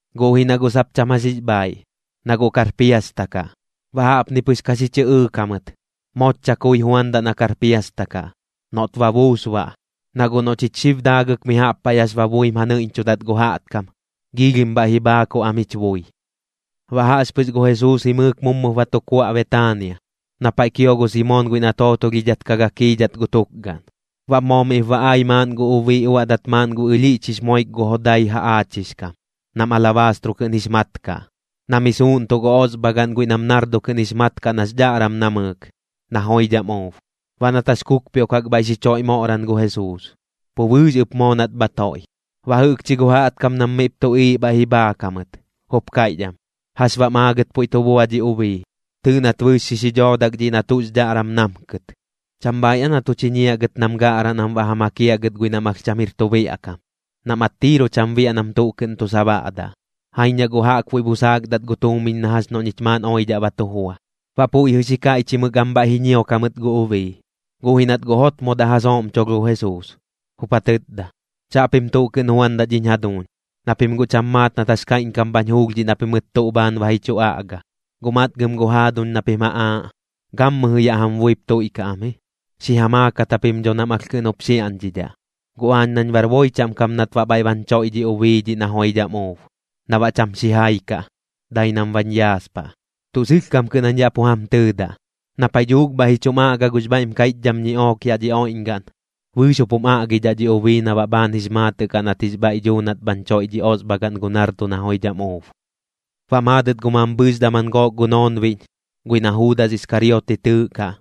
guꞌ ji na guꞌ sap cham jax jix bhaaiꞌ, na guꞌ kar piasta kaꞌ. Baꞌ jaꞌpni pɨx ka xi chɨꞌɨɨk jamɨt: ―Mooch chakui juandaꞌ na kar piasta kaꞌ, noꞌt ba buus baꞌ. Na guꞌ noꞌ chich xib daagɨk mi jaꞌp paiꞌ jax ba buim ja nɨiꞌñchudat gu jaꞌtkam, giilhim bhaiꞌ ji bhaakuꞌ am jich bui. Baꞌ jaꞌxpɨx gu Jesuus jimɨɨk mummup ba tu kuaꞌ Betaania, na paiꞌ kio gu Simoon guiꞌ na tootolhidhat ka gakiidhat gu tukgaꞌn. Baꞌ moo miꞌp ba ai maaꞌn gu ubii uaꞌdat maaꞌn gu ɨlhiꞌch jix moik gu jodai jaꞌaachix kam, nam alabaastro kɨꞌn jix mat kaꞌ, na mi suuꞌntuꞌ gu osbhagaꞌn guiꞌ nam nardo kɨꞌn jix mat kaꞌ nax dhaꞌram namɨɨk, na joidham uub. Baꞌ nat jax kukpioꞌkak bhaiꞌ xi choiꞌ moꞌran gu Jesuus, pu bɨɨx ɨp moo nat bha toiꞌ. Baꞌ jɨꞌkchi gu jaꞌtkam nam miꞌp tuꞌiiꞌ bhaiꞌ ji bhaak jamɨt, jup kaiꞌch am: ―¿Jax baꞌm aagɨt puiꞌ tu bua dhi ubii? Tɨɨꞌ nat bɨɨx xi dhoodak dhiꞌ na tuꞌx dhaꞌram namkɨt. ¿Cham bhaiꞌ aa na tu chiñiaꞌ gɨt nam gaꞌraꞌ nam baꞌ ja makiaꞌ gɨt guiꞌ nam alh cham jir tu biaꞌ kam, nam attiiru cham biaꞌ nam tuꞌ kɨꞌn tu sabaꞌdaꞌ? Jaiñ na guꞌ jaꞌkbuiꞌ busaakdat gu tuumiñ na jax noꞌ ñich maaꞌn oidhaꞌ ba tu jua. Baꞌ puiꞌ jɨꞌ xi kaiꞌchimɨk am bhaiꞌ ji ñiok jamɨt gu ubii, guꞌ ji nat guꞌ jotmodaꞌ ja sooꞌmcholh gu Jesuus, jup ja tɨtda: ―Chaꞌpim tuꞌ kɨꞌn juandaꞌ dhiñ jaduuñ, na pim guꞌ cham maat nat jax kaiꞌñkam bhañ juulh dhiꞌ na pimɨt tuꞌ bhaan ba ji chu aꞌga. Guꞌ matgam gu jaaduñ na pim ja aaꞌ, gammɨjɨ yaꞌ jam buip tuiꞌkaꞌ am ji, xi ja maakat japim dho nam alh kɨꞌn jup xiaꞌñdhidhaꞌ. Guꞌ aañ nañ bar boi chaꞌm kam nat baꞌ bhaiꞌ bañ choiꞌ dhi ubii dhiꞌ na joidham uub, na baꞌ cham xijai kaꞌ, dai nam bañ yaaspaꞌ. Tuꞌ sɨlhkam kɨꞌn jañ yaꞌ pu jam tɨɨdaꞌ, na paiꞌ dhuuk bhaiꞌ ji chum aꞌgaꞌ gux bhaiꞌm kaiꞌchdham ñiꞌook yaꞌ dhi oiꞌñgaꞌn, bɨɨx jup jum aꞌgidhaꞌ dhi ubii na baꞌ bhaan jix maatɨꞌ kaꞌ nat jix bhaiꞌ dhuu nat bhañ choiꞌ dhi osbhagaꞌn gu nardo na joidham uub. Baꞌ maadɨt gu mambhɨɨx daman gook gu noonbiꞌñ, guiꞌ na Juudas Iskariote tɨɨꞌkaꞌ,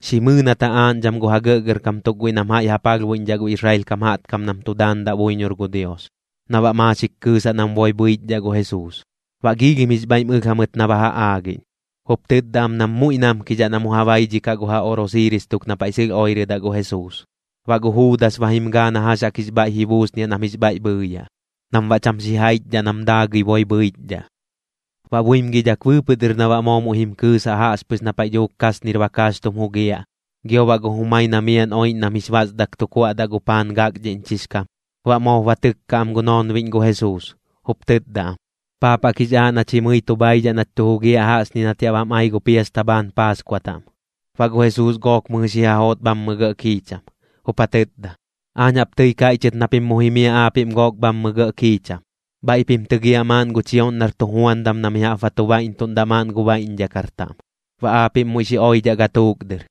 xi mɨɨ nat ja aaꞌñdham gu ja gɇꞌgɇrkam tuk guiꞌ nam jaiꞌ ja palhbuiꞌñdhaꞌ gu Israel kam jaꞌtkam nam tu daandaꞌ buiñor gu Dios, na baꞌ maaxik kɨɨsaꞌ nam boi bhɨichdhaꞌ gu Jesuus. Baꞌ joidham jix bhaiꞌm ɨlh jamɨt na ba ja aagiꞌñ, jup tɨtda am nam muiꞌ namkidhaꞌ na mu ja baidhikaꞌ gu ja oꞌrosiiris tuk na paiꞌ sɨlh oirɨdaꞌ gu Jesuus. Baꞌ gu Juudas ba jim gaa na jax jaꞌk jix bhaiꞌ ji buusniaꞌ nam jix bhaiꞌ bhɨɨyaꞌ, nam baꞌ cham xijaichdhaꞌ nam daagɨi boi bhɨichdhaꞌ. Baꞌ buimgidhak bɨɨpɨꞌ dɨr na baꞌ moo muiꞌ jim kɨɨsaꞌ jaꞌxpɨx na paiꞌ dhuuk kasnir bakaax tum jugiaꞌ, gio baꞌ gu jumai na miaꞌn oiꞌñ nam jix basdak tu kuaꞌdaꞌ gu paan gakdhiꞌñchix kam, baꞌ moop ba tɨkka am gu noonbiꞌñ gu Jesuus, jup tɨtda am: ―¿Paap jaꞌk jix aaꞌ nach jimɨi tu bhaidhaꞌ nach tu jugiaꞌ jaꞌxñi nat yaꞌ bam ai gu piasta bhaan Paaskua taꞌm? Baꞌ gu Jesuus gook mɨjɨ xi ja joot bhammɨ gɇꞌ kiicham, jup ja tɨtda: ―Aañ jaꞌp tɨi kaiꞌchɨt na pim mu jimiaꞌ aapiꞌm gook bhammɨ gɇꞌ kiicham. Bhaiꞌ pim tɨgiaꞌ maaꞌn gu chioꞌñ nar tujuandam na mi jaꞌp ba tu baiꞌntuꞌndaꞌ maaꞌn gu baiꞌñdhakar taꞌm. Baꞌ aapiꞌm muiꞌ xi oidhaꞌ gatuuk dɨr,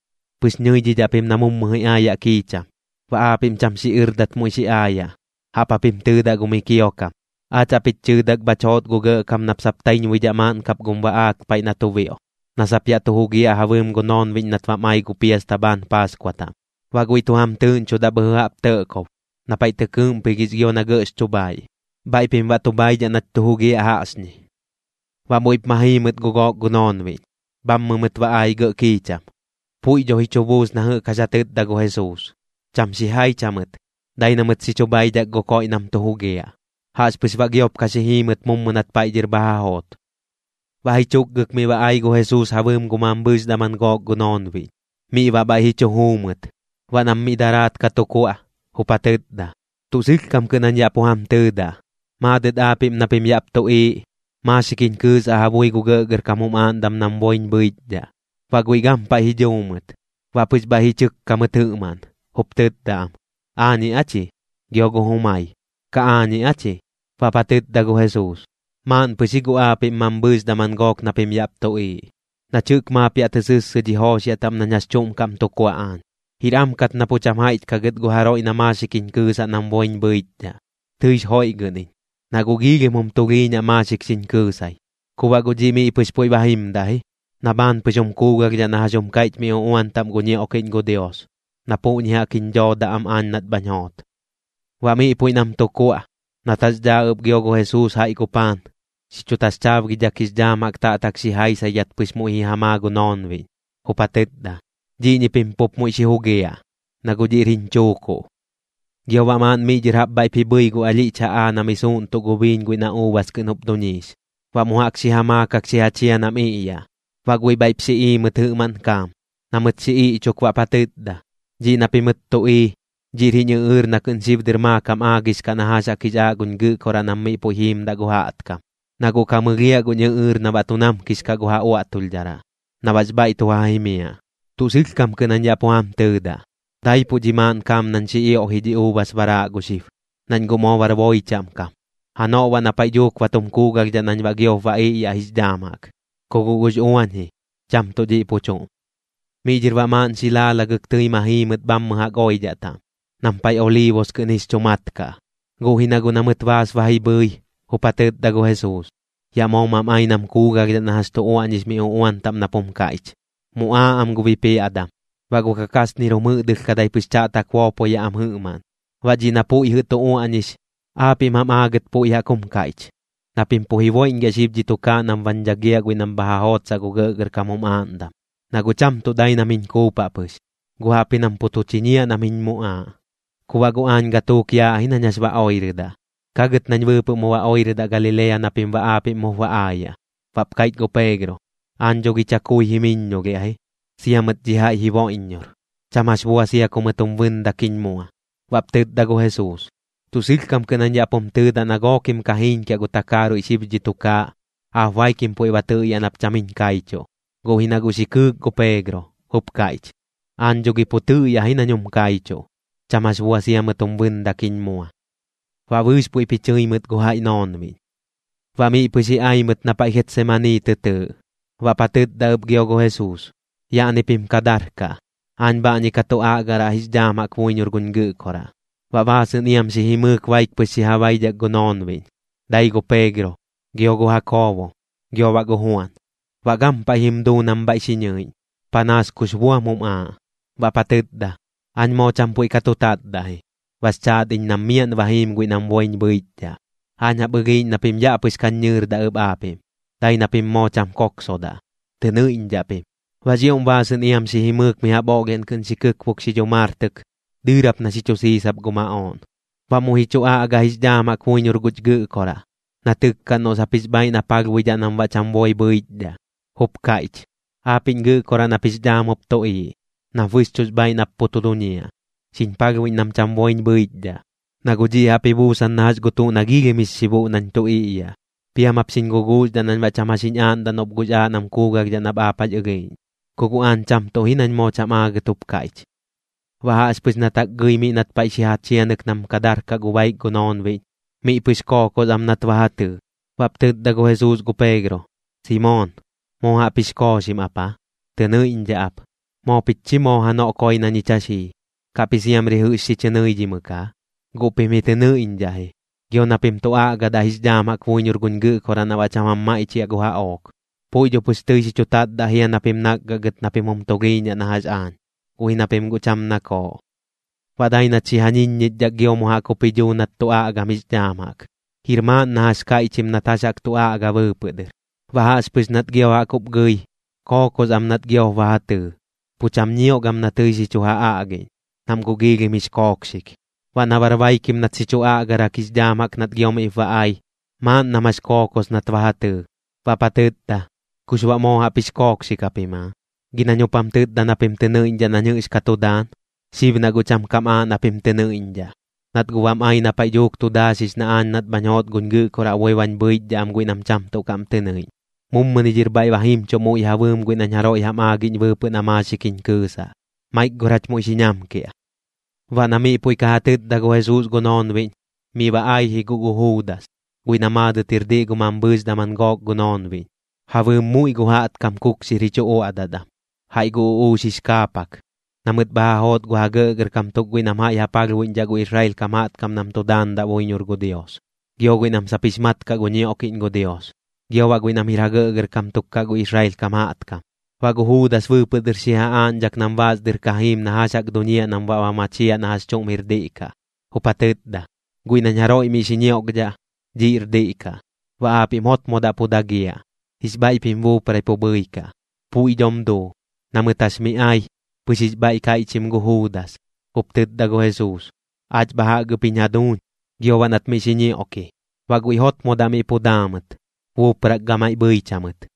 pɨx nɨidhidhaꞌ pim na mummu ji aayaꞌ kiicham. Baꞌ aapiꞌm cham xiꞌɨrdat muiꞌ xi aayaꞌ, jaꞌp japim tɨɨdaꞌ gu miꞌ kiokam: “Aach jaꞌp jich chɨɨdak bhach joot gu Gɇꞌkam nap sap taiñbuidhaꞌ maaꞌn kap gum baꞌaak paiꞌ na tu bioꞌ, na sap yaꞌ tu jugiaꞌ ja bɨɨm gu noonbiꞌñ nat bam ai gu piasta bhaan Paaskua taꞌm.” Baꞌ guiꞌ tu jam tɨɨꞌñchudaꞌ bhɨjɨ jaꞌp tɇꞌkob, na paiꞌ tɨ kɨɨꞌmpigix gio na gɇꞌx chu bhaiꞌ. Bhaiꞌ pim baꞌ tu bhaidhaꞌ nach tu jugiaꞌ jaꞌxñi. Baꞌ muiꞌp ma jii mɨt gu gook gu noonbiꞌñ, bhammɨ mɨt ba ai gɇꞌ kiicham. Puiꞌ dho ji chu buus na jɨꞌk jax ja tɨtda gu Jesuus. Cham xijaich jamɨt, dai na mɨt xi chu bhaidhak gu koiꞌ nam tu jugiaꞌ. Jaꞌxpɨx baꞌ giop ka xi jii mɨt mummu nat paiꞌ dhɨr bha ja joot. Baꞌ ji chukgɨk miꞌ ba ai gu Jesuus ja bɨɨm gu mambhɨɨx daman gook gu noonbiꞌñ. Miꞌ baꞌ bhaiꞌ ji chu juu mɨt. Baꞌ nam miꞌ daraat ka tu kuaꞌ, jup ja tɨtda: ―Tuꞌ sɨlhkam kɨꞌn jañ yaꞌ pu jam tɨɨdaꞌ, maadɨt aapiꞌm na pim yaꞌp tuꞌiiꞌ, maaxik jiñ kɨɨsaꞌ ja bui gu gɇꞌgɇrkam jum aaꞌndam nam boiñ bhɨichdhaꞌ. Baꞌ guiꞌ gampaiꞌ ji dhuu mɨt, baꞌ pɨx bhaiꞌ ji chɨkka mɨt jɨꞌmaꞌn, jup tɨtda am: ―¿Aañiꞌ aa chi? Gio gu jumai: ―¿Kaꞌ aañiꞌ aa chi? Baꞌp ja tɨtda gu Jesuus: ―Maaꞌn pɨx ji guꞌ aapiꞌm mambhɨɨx daman gook na pim yaꞌp tuꞌiiꞌ, nach jɨꞌk maap ya tɨ sɨssɨ dhi jooxiaꞌ taꞌm nañ jax chuꞌm kaꞌm tu kuaꞌ aañ. Jir am kat na pu cham jaiꞌch kaꞌ gɨt gu jaroiꞌ na maaxik jiñ kɨɨsaꞌ nam boiñ bhɨichdhaꞌ. Tɨix joiꞌgɨꞌñ iñ, na guꞌ giilhim jum tulhiiñaꞌ maaxik xiñ kɨɨsai. Ku baꞌ guꞌ dhiꞌ miꞌ pɨx puiꞌ ba jimdaꞌ ji, na bhaan pɨx jum kuugalhdhaꞌ na jax jum kaiꞌch mi uꞌuan taꞌm gu ñioꞌkiꞌñ gu Dios, na puꞌñi jaꞌk jiñ dhoodaꞌ am aañ nat bhañ joot. Baꞌ miꞌ puiꞌ nam tu kuaꞌ, nat jax dhaa ɨp gio gu Jesuus jaiꞌ gu paan, xi chu taxchaabgidhak jix dhaam jaꞌk taꞌtak xi jaisaidhat pɨx muiꞌ ji ja maa gu noonbiꞌñ, jup ja tɨtda: ―Dhiꞌñi pim pup muiꞌ xi jugiaꞌ, na guꞌ dhiꞌr jiñ chuukuꞌ. Gio baꞌ maaꞌn miꞌ dhɨr jaꞌp bhaiꞌp ji bhɨi gu alhiꞌch jaꞌaa na mi suuꞌntuꞌ gu biiñ guiꞌ na uubas kɨꞌn jup duñiix, baꞌ mu jaꞌk xi ja maakak xi ja chia nam iꞌyaꞌ. Baꞌ guiꞌ bhaiꞌp xi ii mɨt jɨꞌmaꞌn kaam. Na mɨt xi iꞌchuk baꞌp ja tɨtda: ―Dhiꞌ na pimɨt tu ii, dhiꞌr jiñ ɨꞌɨɨr na kɨꞌn xib dɨr maakam aagix kaꞌ na jax jaꞌk jix aaꞌ guñ Gɨꞌkoraꞌ nam miꞌ puiꞌ jiimdaꞌ gu jaꞌtkam, na guꞌ ka mɨlhiaꞌ guñ ɨꞌɨɨr na baꞌ tu namkix kaꞌ gu ja uaꞌtulhdharaꞌ, na baꞌx bhaiꞌ tu ja jimiaꞌ. Tuꞌ sɨlhkam kɨꞌn jañ yaꞌ pu jam tɨɨdaꞌ, daipuꞌ dhi maaꞌn kaam nañ xi ioꞌji dhi uubas baraaꞌ gu xib, nañ guꞌ moo bar boi chaꞌm kam. Janoꞌ baꞌ na paiꞌ dhuuk ba tum kuugalhdhaꞌ nañ baꞌ giop ba iꞌyaꞌ jix dhaam jaꞌk, ku guꞌ gux uañ ji, cham tuꞌ dhiꞌ pu chuꞌm. Miꞌ dhɨr baꞌ maaꞌn xi laalagɨk tɨi ma jii mɨt bhammɨ jaꞌk oidhaꞌ taꞌm, nam paiꞌ Oliibus kɨꞌn jix chu mat kaꞌ. Guꞌ ji na guꞌ na mɨt baas ba ji bhɨi, jup ja tɨtda gu Jesuus: ―Yaꞌ moo mam ai nam kuugalhdhaꞌ na jax tu uaꞌñix mi uꞌuan taꞌm nap jum kaiꞌch: “Muꞌaaꞌ am gu bipiaꞌdam, baꞌ gu kakasnir jum jɨꞌdɨlhkadai pɨx chaꞌtak boopoyaꞌ am jɨꞌmaꞌn.” Baꞌ dhiꞌ na puiꞌ jɨꞌ tu uaꞌñix, aapiꞌm jam aagɨt puiꞌ jaꞌk jum kaiꞌch, na pim pu jiboiꞌñgiaꞌ xib dhi tukaaꞌ nam bañ dhagiaꞌ guiꞌ nam bha ja jootsaꞌ gu gɇꞌgɇrkam jum aaꞌndam. Na guꞌ cham tuꞌ dai nam jiñ kuupaꞌ pɨx, guꞌ jaꞌpji nam pu tu chiñiaꞌ nam jiñ muꞌaaꞌ. Ku baꞌ guꞌ aañ gatuuk yaaꞌ ji nañ jax ba oirɨdaꞌ. Kagɨt nañ bɨɨpɨꞌ mu ba oirɨdaꞌ Galilea na pim baꞌ aapiꞌm mup ba aayaꞌ. Baꞌp kaiꞌch gu Peegro: ―Aañ dho gi chakui jimɨiññolhiaꞌ ji, sia mɨt dhi jaiꞌ jiboiꞌññor. Cham jax bua sia ku mɨt jum bɨndak jiñ dhaa. Baꞌp tɨtda gu Jesuus: ―Tuꞌ sɨlhkam kɨꞌn jañ yaꞌ pum tɨɨdaꞌ na gookim ka jiiñkiaꞌ gu takaaruiꞌ xib dhi tukaaꞌ, aap baikim puiꞌ ba tɨꞌyaꞌ nap cham jiñ kaichuꞌ. Guꞌ ji na guꞌ xi kɨɨk gu Peegro, jup kaiꞌch: ―Aañ dho gi pu tɨꞌyaꞌ ji nañ jum kaichuꞌ, cham jax bua sia mɨt jum bɨndak jiñ mua. Baꞌ bɨɨx puiꞌp ji chɨi mɨt gu jaiꞌ noonbiꞌñ. Baꞌ miꞌ pɨx ji ai mɨt na paiꞌ Getsamanii tɨ tɨɨꞌ, baꞌp ja tɨtda ɨp gio gu Jesuus: ―Yaꞌni pim ka darkaꞌ. Aañ bhaꞌñi ka tu aꞌgaraꞌ jix dhaam jaꞌk buiñor guñ Gɨꞌkoraꞌ. Baꞌ baasɨꞌn iam xi jimɨɨk baik pɨx xi ja baidhak gu noonbiꞌñ, dai gu Peegro, gio gu Jakoobo, gio baꞌ gu Juan. Baꞌ gampaiꞌ jim duu nam bhaiꞌ xi ñɨiꞌñ, panaas kux buam jum aaꞌ, baꞌp ja tɨtda: ―Aañ moo cham puiꞌ ka tu tatdaꞌ ji, bax chaat iñ nam miaꞌn ba jiim guiꞌ nam boiñ bhɨichdhaꞌ. Aañ jaꞌp ɨlhiiꞌñ na pim yaꞌ pɨx kañ ñɨɨrdaꞌ ɨp aapiꞌm, dai na pim moo cham kooksodaꞌ, tɨ nɨiꞌñdhaꞌ pim. Baꞌx ioꞌm baasɨꞌn iam xi jimɨɨk mi jaꞌp oꞌlhiaꞌn kɨꞌn xi kɨkbuk xi dhumartɨk, dɨɨrap na xi chu siisap gu maꞌooꞌn. Baꞌ muiꞌ ji chu aꞌga jix dhaam jaꞌk buiñor guch Gɨꞌkoraꞌ, na tɨkkaꞌn noꞌ sap jix bhaaiꞌ na palhbuidhaꞌ nam baꞌ cham boi bhɨichdhaꞌ, jup kaiꞌch: ―Aapiꞌñ Gɨꞌkoraꞌ nap jix dhaam jup tuꞌiiꞌ, nap bɨxchuꞌx bhaaiꞌ nap pu tu duñiaꞌ, xiñ palhbuiꞌñ nam cham boiñ bhɨichdhaꞌ, na guꞌ dhiꞌ jaꞌp ji buusan na jax gu tuꞌ na giilhim jix xibuꞌ nañ tu iꞌyaꞌ. Piam jap xiñ guguuxdhaꞌ nañ baꞌ cham jax jiñ aaꞌndaꞌ noꞌp guꞌx aaꞌ nam kuugalhdhaꞌ nap aap jax ɨlhiiꞌñ. Ku guꞌ aañ cham tuꞌ ji nañ moo cham aagɨt jup kaiꞌch. Baꞌ jaꞌxpɨx nat jaꞌk gɨi miꞌ nat paiꞌ xi ja chianɨk nam ka darkaꞌ gu baik gu noonbiꞌñ, miꞌ pɨx kookos am nat ba ja tɨɨ. Baꞌp tɨtda gu Jesuus gu Peegro: ―Simoon, ¿moo jaꞌp jix kooxim ap aa? Tɨ nɨiꞌñdhaꞌ ap. Moo pich chi moo janoꞌ koi na ñich jax jii. ¿Kaꞌp ji siamri jɨꞌx xi chɨ nɨidhimɨk aa? Guꞌ pim ji tɨ nɨiꞌñdhaꞌ ji, gio na pim tu aꞌgadaꞌ jix dhaam jaꞌk buiñor guñ Gɨꞌkoraꞌ na baꞌ cham jam maiꞌchiaꞌ gu jaꞌook. Puiꞌ dho pɨx tɨi xi chu tatdaꞌ jia na pim nakgaꞌ gɨt na pim jum tulhiiñaꞌ na jax aañ, guꞌ ji na pim guꞌ cham nakooꞌ. Baꞌ dai nat xi ja ñiññichdhak gio mu jaꞌk jup ji dhuu nat tu aꞌgam jix dhaam jaꞌk, jir maaꞌn na jax kaiꞌchim nat jax jaꞌk tu aꞌga bɨɨpɨꞌ dɨr. Baꞌ jaꞌxpɨx nat gio jaꞌk jup gɨi, kookos am nat giop ba ja tɨɨ, pu cham ñiok am na tɨi xi chu ja aꞌgiꞌñ, nam guꞌ giilhim jix kookxik. Baꞌ na bar baikim nat xi chu aꞌgarak jix dhaam jaꞌk nat gio miꞌp ba ai, maaꞌn nam jax kookos nat ba ja tɨɨ, baꞌp ja tɨtda: ―¿Kux baꞌ moo jaꞌp jix kookxik japim aa? Gi nañ jup jam tɨtda na pim tɨ nɨiꞌñdhaꞌ nañ jɨꞌx ka tu daan. Xib na guꞌ cham kam aaꞌ na pim tɨ nɨiꞌñdhaꞌ, nat guꞌ bam ai na paiꞌ dhuuk tu daaxix na aañ nat bhañ joot guñ Gɨꞌkoraꞌ boi bañ bhɨichdhaꞌ am guiꞌ nam cham tuꞌ kaꞌm tɨ nɨiꞌñ. Mummuni dhɨr bhaiꞌ ba jimchuꞌ muiꞌ ja bɨɨm guiꞌ nañ jaroiꞌ jam aagiꞌñ bɨɨpɨꞌ na maaxik jiñ kɨɨsaꞌ. Maik gor jach muiꞌ xi ñamkiaꞌ. Baꞌ na puiꞌ jɨꞌ ka ja tɨtda gu Jesuus gu noonbiꞌñ, miꞌ ba ai ji guꞌ gu Juudas, guiꞌ na maadɨt jir diꞌ gu mambhɨɨx daman gook gu noonbiꞌñ, ja bɨɨm muiꞌ gu jaꞌtkam kukxir ji chu uaꞌdat am, jaiꞌ gu uꞌuux jix kaapak, na mɨt bha ja joot gu ja gɇꞌgɇrkam tuk guiꞌ nam jaiꞌ ja palhbuiꞌñdhaꞌ gu Israel kam jaꞌtkam nam tu daandaꞌ buiñor gu Dios, gio guiꞌ nam sap jix mat kaꞌ gu ñioꞌkiꞌñ gu Dios, gio baꞌ guiꞌ nam jir ja gɇꞌgɇrkam tuk kaꞌ gu Israel kam jaꞌtkam. Baꞌ gu Juudas bɨɨpɨꞌ dɨr xi ja aaꞌñdhak nam baas dɨr ka jiim na jax jaꞌk duñiaꞌ nam baꞌ ba machiaꞌ na jax chuꞌm jir diꞌ kaꞌ, jup ja tɨtda: ―Guiꞌ nañ jaroiꞌ miꞌ xi ñioꞌkdhaꞌ, dhiꞌr diꞌ kaꞌ. Baꞌ aapiꞌm jotmodaꞌ miꞌ pu dagiaꞌ, jix bhaiꞌ pim buuprai pu bhɨikaꞌ. Puiꞌ dhom duu. Na mɨt jax miꞌ ai, pɨx jix bhaiꞌ kaiꞌchim gu Juudas, jup tɨtda gu Jesuus: ―Aach bha jaꞌk ɨp jiñ jaduuñ. Gio baꞌ nat miꞌ xi ñioꞌki. Baꞌ guiꞌ jotmodaꞌ miꞌ pu daa mɨt, buuprak gamaiꞌ pu bhɨich jamɨt.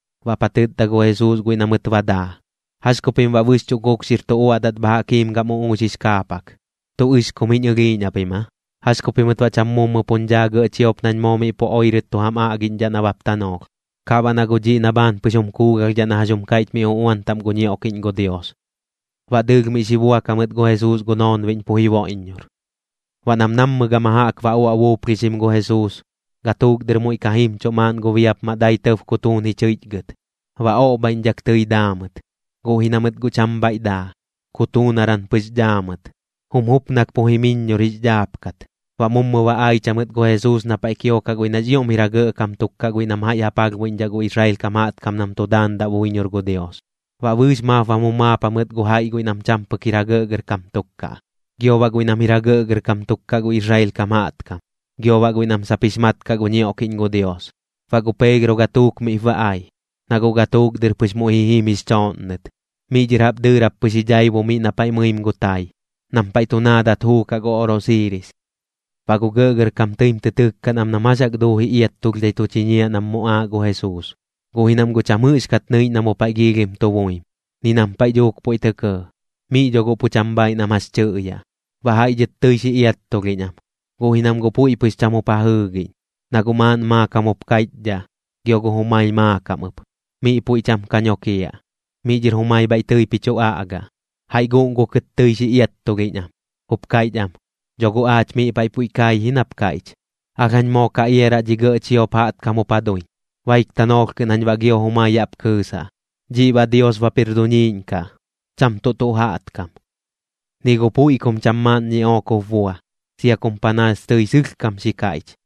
Baꞌp ja tɨtda gu Jesuus guiꞌ na mɨt ba daa: ―¿Jax ku pim baꞌ bɨxchuꞌ kukxir tu uaꞌdat bha jaꞌk jiim gam uꞌux jix kaapak? ¿Tuꞌ ɨxkum jiñ ɨlhiiꞌñ japim aa? ¿Jax ku pimɨt baꞌ cham mummu puñ dhaa gɇꞌ chiop nañ moo miꞌ pu oirɨt tu jam aꞌgiꞌñdhaꞌ nabap tanoolh? Kaꞌ baꞌ na guꞌ dhiꞌ na bhaan pɨx jum kuugalhdhaꞌ na jax jum kaiꞌch mi uꞌuan taꞌm gu ñioꞌkiꞌñ gu Dios. Baꞌ dɨɨlh miꞌ xi buak jamɨt gu Jesuus gu noonbiꞌñ pu jiboiꞌññor. Baꞌ nam nammɨ gama jaꞌk ba uaꞌ buuplhixim gu Jesuus, gatuuk dɨr muiꞌ ka jimchuꞌ maaꞌn gu biapmaꞌ dai tɇb kutuun ji chɨiꞌchgɨt. Baꞌ oꞌbhaiꞌñdhak tɨi daa mɨt, guꞌ ji na mɨt guꞌ cham bhaiꞌ daa, kutuunaran pɨx daa mɨt. Jum jupnak pu jimɨiññor jix dhaapkat. Baꞌ mummu ba aich jamɨt gu Jesuus na paiꞌ kiokaꞌ guiꞌ nax ioꞌm jir ja gɇꞌkam tuk kaꞌ guiꞌ nam jaiꞌ ja palhbuiꞌñdhaꞌ gu Israel kam jaꞌtkam nam tu daandaꞌ buiñor gu Dios. Baꞌ bɨɨx maap bam jumaap jamɨt gu jaiꞌ guiꞌ nam cham pɨk jir ja gɇꞌgɇrkam tuk kaꞌ, gio baꞌ guiꞌ nam jir ja gɇꞌgɇrkam tuk kaꞌ gu Israel kam jaꞌtkam, gio baꞌ guiꞌ nam sap jix mat kaꞌ gu ñioꞌkiꞌñ gu Dios. Baꞌ gu Peegro gatuuk miꞌp ba ai, na guꞌ gatuuk dɨr pɨx muiꞌ ji jim jix chooꞌnnɨt. Miꞌ dhɨr jaꞌp dɨɨrap pɨx ji dhaibu miꞌ na paiꞌ mɨim gu tai, nam paiꞌ tu naadat juukaꞌ gu oꞌrosiiris. Baꞌ gu gɇꞌgɇrkam tɨim tɨ tɨkkaꞌn am nam jax jaꞌk duuji iattulhdhai tu chiñiaꞌ nam muꞌaaꞌ gu Jesuus, guꞌ ji nam guꞌ cham jɨꞌxkat nɨiꞌñ na mu paiꞌ giilhim tu buim, ni nam paiꞌ dhuuk puiꞌ tɇ kɇɇ. Miꞌ dho guꞌ pu cham bhaaiꞌ nam jax tɨꞌyaꞌ. Baꞌ jaiꞌ dhɨt tɨi xi iattulhiꞌñ am, guꞌ ji nam guꞌ puiꞌ pɨx cham jup ja jɨɨgiꞌñ, na guꞌ maaꞌn maakam jup kaiꞌchdhaꞌ, gio gu jumai maakam ɨp. Miꞌ puiꞌ cham ka nokiaꞌ, miꞌ dhɨr jumai bhaiꞌ tɨip ji chu aꞌgaꞌ. Jaiꞌ guꞌngukɨt tɨi xi iattulhiꞌñ am, jup kaiꞌch am: ―Dho guꞌ aach miꞌ paiꞌ puiꞌ kai ji nap kaiꞌch: “Alh jañ moo ka iaraꞌ dhi gɇꞌ chiop jaꞌtkam jup ja duiñ, baik tanoolh kɨꞌn jañ baꞌ gio jumai yaꞌp kɨɨsaꞌ, dhiꞌ baꞌ Dios bap jir duñiiꞌñ kaꞌ, cham tuꞌ tuꞌ jaꞌtkam.” Ni gu puiꞌ kum cham maaꞌn ñiꞌook jup bua, sia kum panaas tɨi sɨlhkam kam xi kaiꞌch.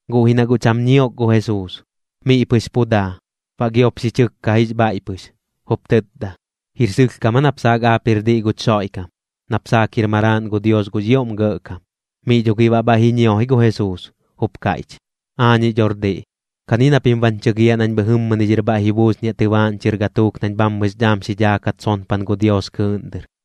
Guꞌ ji na guꞌ cham ñiok gu Jesuus, miꞌ pɨx pu daa. Baꞌ giop xi chɨkka jix bhaiꞌ pɨx, jup tɨtda: ―¿Jir sɨlhkam aa nap saak aap jir diꞌ guch Xoiꞌkam, nap saak jir Maraaꞌn gu Dios gux ioꞌm Gɇꞌkam? Miꞌ dho gi baꞌ bhaiꞌ ji ñio ji gu Jesuus, jup kaiꞌch: ―Aañiꞌ dhor diꞌ. Kani na pim bañ chɨgiaꞌ nañ bhɨjɨmmɨni dhɨr bhaiꞌ ji buusniaꞌ tɨbaaꞌñ chɨr gatuuk nañ bhammɨx dhaam xi dhaakat sonpan gu Dios kɨɨꞌn dɨr.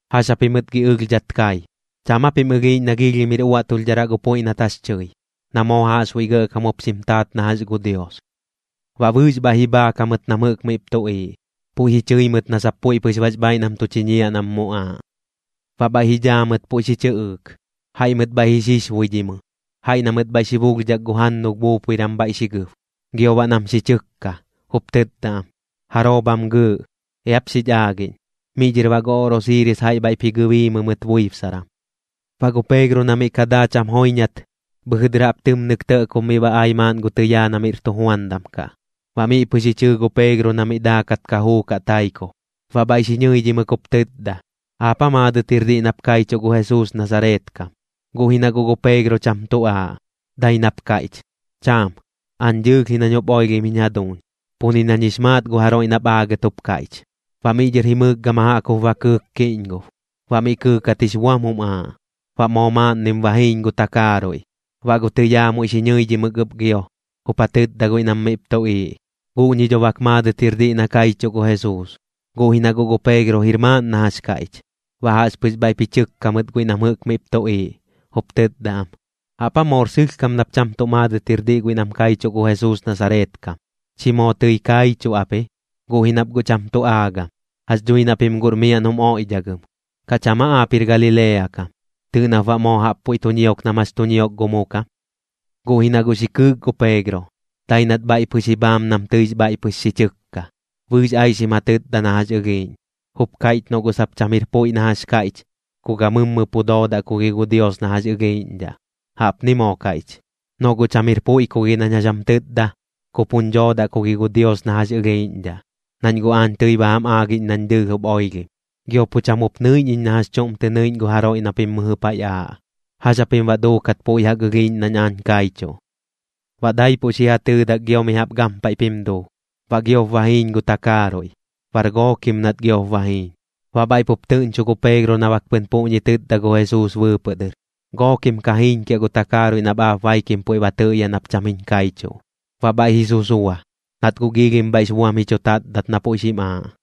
¿Jax japimɨt gi ɨlhdhat kai? ¿Cham aa pim ɨlhiiꞌñ na giilhim jir uaꞌtulhdharaꞌ gu puiꞌ nat jax tɨi, na moo jaꞌxbuiꞌ gɇꞌkam jup xim taat na jax gu Dios? Baꞌ bɨɨx bhaiꞌ ji bhaak jamɨt nam jɨꞌk miꞌp tuꞌiiꞌ, puiꞌ ji chɨi mɨt na sap puiꞌ pɨx bax bhaaiꞌ nam tu chiñiaꞌ nam muꞌaaꞌ. Baꞌ bhaiꞌ ji dhaa mɨt puiꞌ xi chɨꞌɨɨk. Jaiꞌ mɨt bhaiꞌ ji xixbuidhimɨ, jaiꞌ na mɨt bhaiꞌ xi bulhdhak gu jannulh buupuiran bhaiꞌ xi gɨb, gio baꞌ nam xi chɨkka, jup tɨtda am: ―¿Jaroo bham gɨɨꞌ? Eap xich aagiꞌñ. Miꞌ dhɨr baꞌ gu oꞌrosiiris jaiꞌ bhaiꞌp ji gɨbiimɨ mɨt buibsaran. Baꞌ gu Peegro na miꞌ ka daa cham joiñat, bhɨjɨ dɨr jaꞌp tɨmnɨk tɇꞌkob miꞌ ba ai maaꞌn gu tɨyaa na miꞌr tujuandam kaꞌ. Baꞌ miꞌ pɨx ji chɨɨ gu Peegro na miꞌ daakat ka juukaꞌ taikob, baꞌ bhaiꞌ xi ñɨidhimɨk jup tɨtda: ―¿Aap aa maadɨt jir diꞌ nap kaichuꞌ gu Jesuus Nasareet kam? Guꞌ ji na guꞌ gu Peegro cham tu aaꞌ, dai nap kaiꞌch: ―Cham. Aañ dɨɨlh ji nañ jup oilhim jiñ jaduuñ. Pu ni nañ jix maat gu jaroiꞌ nap aagɨt jup kaiꞌch. Baꞌ miꞌ dhɨr jimɨɨk gama jaꞌk jup ba kɨɨk kiꞌñgob. Baꞌ mi kɨɨkat jix buam jum aaꞌ, baꞌ moo maaꞌnnim ba jiiñ gu takaaruiꞌ. Baꞌ gu tɨyaa muiꞌ xi ñɨidhimɨk ɨp gio, jup ja tɨtda guiꞌ nam miꞌp tuꞌiiꞌ: ―Guꞌñi dho bak maadɨt jir diꞌ na kaichuꞌ gu Jesuus. Guꞌ ji na guꞌ gu Peegro jir maaꞌn na jax kaiꞌch. Baꞌ jaꞌxpɨx bhaiꞌp ji chɨkka mɨt guiꞌ nam jɨꞌk miꞌp tuꞌiiꞌ, jup tɨtda am: ―¿Jaꞌp aa moor sɨlhkam nap cham tuꞌ maadɨt jir diꞌ guiꞌ nam kaichuꞌ gu Jesuus Nasareet kam? Chi moo tɨi kaichuꞌ ap ji, guꞌ ji nap guꞌ cham tu aagam. Jax dhui na pim guꞌr miaꞌn jum oiꞌdhagɨm. ¿Kaꞌ cham aa aap jir Galilea kam? Tɨɨꞌ nap baꞌ moo jaꞌp puiꞌ tu ñiok nam jax tu ñiok gu mu kam. Guꞌ ji na guꞌ xi kɨɨk gu Peegro, dai nat bhaiꞌ pɨx ji bhaam nam tɨix bhaiꞌ pɨx xi chɨkka. Bɨɨx aixim ja tɨtda na jax ɨlhiiꞌñ, jup kaiꞌch noꞌ guꞌ sap cham jir puiꞌ na jax kaiꞌch, ku gammɨjɨ pu doodaꞌ ku gi gu Dios na jax ɨlhiiꞌñdhaꞌ. Jaꞌpni moo kaiꞌch: ―Noꞌ guꞌ cham jir puiꞌ ku gi nañ jax jam tɨtda, ku puñ dhoodaꞌ ku gi gu Dios na jax ɨlhiiꞌñdhaꞌ, nañ guꞌ aañ tɨi ba jam aagiꞌñ nañ dɨɨlh jup oilhim. Gio pu cham jup nɨiꞌñ iñ na jax chuꞌm tɨ nɨiꞌñ gu jaroiꞌ na pim mɨjɨ paiꞌ aaꞌ. ¿Jax japim baꞌ duukat puiꞌ jaꞌk ɨlhiiꞌñ nañ aañ kaichuꞌ? Baꞌ daipuꞌ xi ja tɨɨdak gio mi jaꞌp gampaiꞌp jim duu. Baꞌ giop ba jiiñ gu takaaruiꞌ, bar gookim nat giop ba jiiñ. Baꞌ bhaiꞌ pup tɨꞌñcho gu Peegro na bak pɨn puꞌñi tɨtda gu Jesuus bɨɨpɨꞌ dɨr: “Gookim ka jiiñkiaꞌ gu takaaruiꞌ nap aap baikim puiꞌ ba tɨꞌyaꞌ nap cham jiñ kaichuꞌ.” Baꞌ bhaiꞌ ji susua, nat guꞌ giilhim bhaiꞌx buam ji chu tatdat na puiꞌ xim aaꞌ.